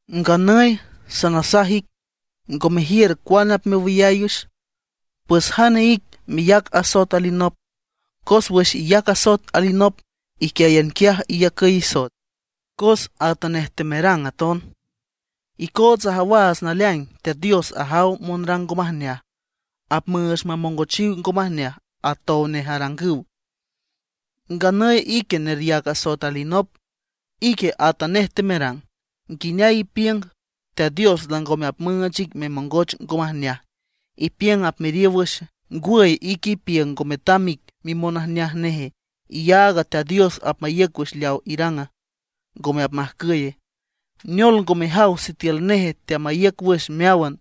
Nganüy sanasaj ic, ngo mejiür cuane apmewüyay wüx, ¿pues jane ic meyac asoet alinop? Cos wüx iyac asoet alinop iquiáyan quiaj iyacüy isoet, cos atanej temerang aton. Icootsa ajawaats naleaing Teat Dios ajaw monrang ngo majneaj; apmüüch mamongochiw ngo majneaj atow nej arangüw. Nganüy ique neryac asoet alinop, ique atanej temerang. ¿Nguineay ipiünga, Teat Dios langome apmüüch ic memongoch ngo majneaja, ipiüng apmeriow wüxe? ¿Ngwüy, ique ipiüng ngo metam ic mimonajneaj neje, iyaag Teat Dios apmaíüc wüx leaw irang, ngome apmajcüye? Neol ngo mejaw sitiül nej teamaíüc wüx meáwan,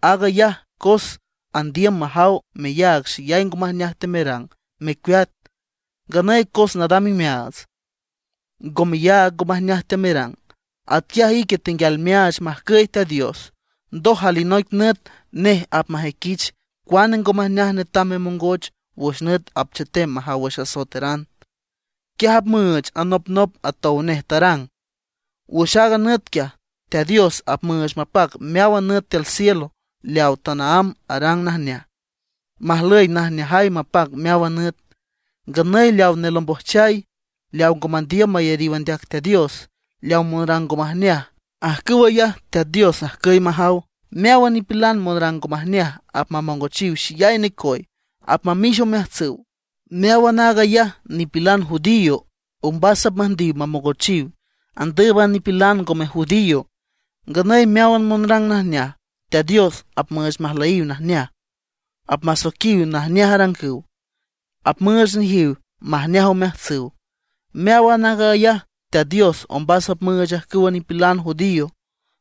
aag ayaj cos andiüm majaw meyaag xeyay ngo majneaj temerang, mecueat. Nganüy cos nadam imeaats, ngo meyaag ngo majneaj teamerang. Atquiaj ique tenguial meaach majcüy Teat Dios, ndoj alinoic nüt nej apmajüiquich cuane ngo majneaj netam memongoch wüx nüt apchetem majaw wüx asoeteran. Quiaj apmüüch anopnop atow nej tarang. Wüx aaga nüt quiaj, Teat Dios apmüüch mapac meáwan nüt tiül cielo leaw tanaámb arang najneaj, majlüy najneajay mapac meáwan nüt. Nganüy leaw nelombojchay, leaw ngo mandiüm mayariw andeac Teat Dios, leaw monrang ngo majneaj; ajcüw ayaj Teat Dios ajcüy majaw. Meáwan nipilan monrang ngo majneaj apmamongochiw xeyay necoy, apmamix omeajtsüw. Meáwan aag ayaj nipilan judío ombas apmüjndiw mamongochiw, andǘüban a nipilan ngome judío. Nganüy meáwan monrang najneaj, Teat Dios apmüüch majlüyiw najneaj, apmasoiquiw najneaj arangüw, apmüüch nejiw majneaj omeajtsüw. Meáwan aag ayaj Teat Dios ombas apmüüch ajcüwa nipilan judío,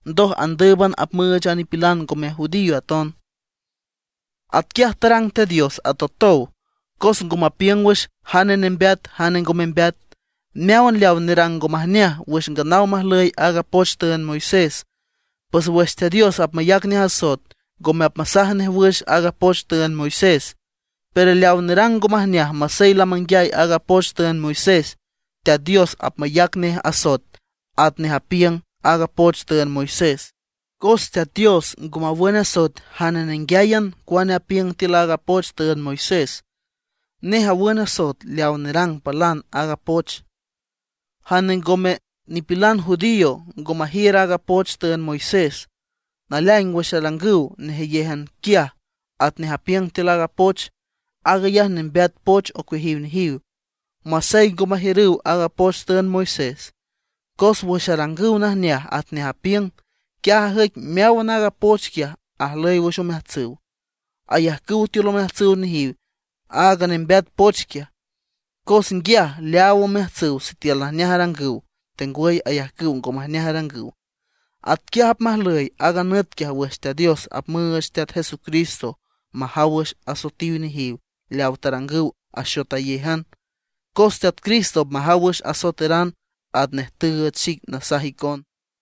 ndoj andǘüban apmüüch a nipilan ngome judío aton. Atquiaj arang Teat Dios atotow, cos ngo mapiüng wüx jane nembeat jane ngo membeat. Meáwan leaw nerang ngo majneaj wüx nganaw majlüy aaga poch tüünd Moisés; pues wüx Teat Dios apmayac nej asoet, ngome apmasaj nej wüx aaga poch tüünd Moisés. Pero leaw nerang ngo majneaj masey lamanguiay aaga poch tüünd Moisés, Teat Dios apmayac nej asoet atnej apiüng aaga poch tüünd Moisés. Cos Teat Dios ngo mawün asoet jane nenguiáyan cuane apiüng tiül aaga poch tüünd Moisés. Nej awün asoet leaw nerang palan aaga poch. Jane ngome nipilan judío ngo majiür aaga poch tüünd Moisés. Naleaing wüx arangüw nejeyéjan quiaj atnej apiüng tiül aaga poch, aag ayaj nembeat poch ocueajiw nejiw, masey ngo majiürüw aaga poch tüünd Moisés. Cos wüx arangüw najneaj atnej apiüng, quiaj ajüic meáwan aaga poch quiaj ajlüy wüx omeajtsüw. Ayajcüw tiül omeajtsüw nejiw aaga nembeat poch quiaj, cos nguiaj leaaw omeajtsüw sitiül najneaj arangüw tengwüy ayajcüw ngo majneaj arangüw. Atquiaj apmajlüy aaga nüt quiaj wüx Teat Dios apmüüch Teat Jesucristo majaw wüx asoetiw nejiw leawa tarangüw axotayéjan. Cos Teat Cristo apmajaw wüx asoeteran atnej tüüch xic nasaj icon.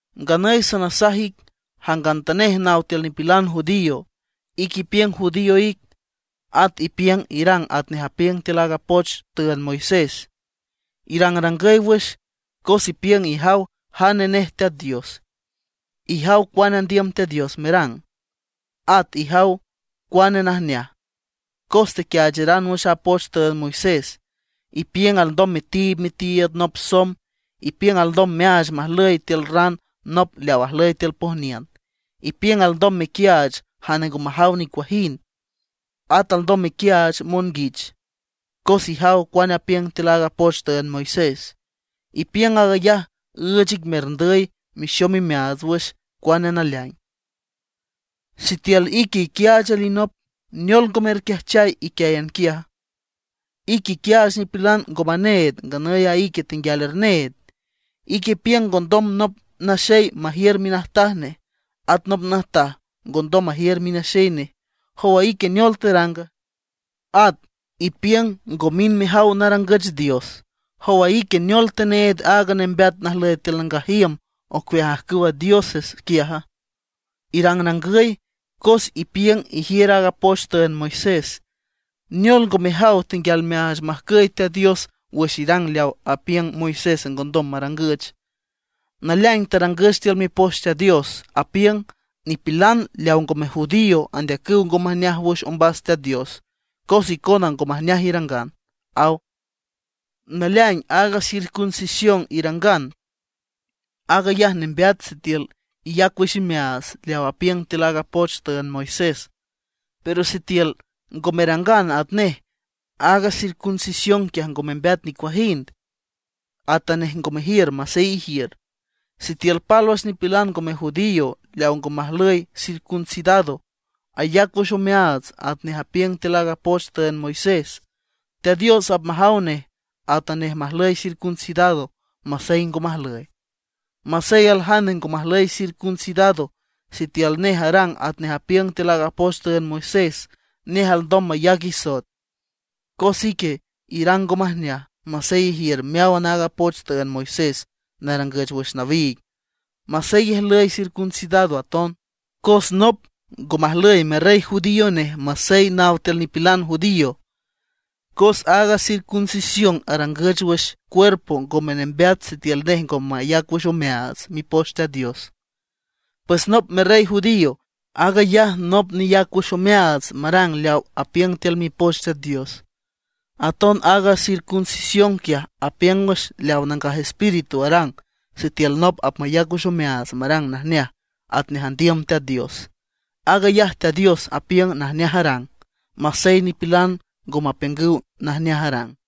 Nganüy sanasaj ic jangantanej naw tiül nipilan judío, ique ipiüng judío ic. At ipiüng irang atnej apiüng tiül aaga poch tüünd Moisés. Irangrangüy wüx cos ipiüng ijaw jane nej Teat Dios. Ijaw cuane andiüm Teat Dios merang, at ijaw cuane najneaj, cos tequiaacharan wüx a poch tüünd Moisés. Ipiüng alndom metiib mitiiüd nop somb; ipiüng alndom meaach majlüy tiül ran nop leaw ajlüy tiül pojniün. Ipiüng alndom mequiaach jane ngo majaw nicuajind; at alndom mequiaach monguich, cos ijaw cuane apiüng tiül aaga poch tüünd Moisés. Ipiüng aag ayaj üüch ic merndüy mexom imeaats wüx cuane naleaing. Sitiül ique iquiaach alinop, ¿neol ngo merquiajchay iquiáyan quiaja? Ique iquiaach nipilan ngo maneed, nganüy a ique tenguial erneed. Ique ipiüng ngondom nop naxey majiür minajtaj nej, at nop najtaj ngondom majiür minaxey nej. ¿Jow a ique neol teranga? At ipiüng ngo mind mejaw narangüch dios. ¿Jow a ique neol teneed aaga nembeat najlüy tiül nangaj iüm ocueaj ajcüwa dioses quiaja? Irangrangüy, cos ipiüng ijiür aaga poch tüünd Moisés. ¿Neol ngo mejaw, tenguial meaach majcüy Teat Dios wüx irang leaw apiüng Moisés ngondom marangüch? Naleaing tarangüch tiül Mipoch Teat Dios, apiüng: “Nipilan leaw ngome judío andeacüw ngo majneaj wüx ombas Teat Dios cos icona ngo majneaj irangan”, aw. Naleaing aaga circuncisión irangan, aag ayaj nembeat sitiül iyac wüx imeaats leaw apiüng tiül aaga poch tüünd Moisés. Pero sitiül ngo merang atnej, aaga circuncisión quiaj ngo membeat nicuajind, atanej ngo mejiür masey ijiür. Sitiül pálwüx nipilan ngome judío leaw ngo majlüy circuncidado ayac wüx omeaats atnej apiüng tiül aaga poch tüünd Moisés, Teat Dios apmajaw nej atanej majlüy circuncidado, masey ngo majlüy. Masey aljane ngo majlüy circuncidado, sitiül nej arang atnej apiüng tiül aaga poch tüünd Moisés, nej alndom mayac isoet, cos ique irang ngo majneaj, masey ijiür meáwan aaga poch tüünd Moisés narangüch wüx nawiig, masey ijlüy circuncidado aton. Cos nop ngo majlüy merrey judío nej masey naw tiül nipilan judío, cos aaga circuncisión arangüch wüx cuerpo ngome nembeat sitiül nej ngo mayac wüx omeaats Mipoch Teat Dios. Pues nop merrey judío, aag ayaj nop neyac wüx omeaats marang leaw apiüng tiül Mipoch Teat Dios. Aton aaga circuncisión quiaj apiüng wüx leawa Nangaj Espíritu arang sitiül nop apmayac wüx omeaats marang najneaj atnej andiüm Teat Dios. Aag ayaj Teat Dios apiüng najneaj arang, masey nipilan ngo mapiüngüw najneaj arang.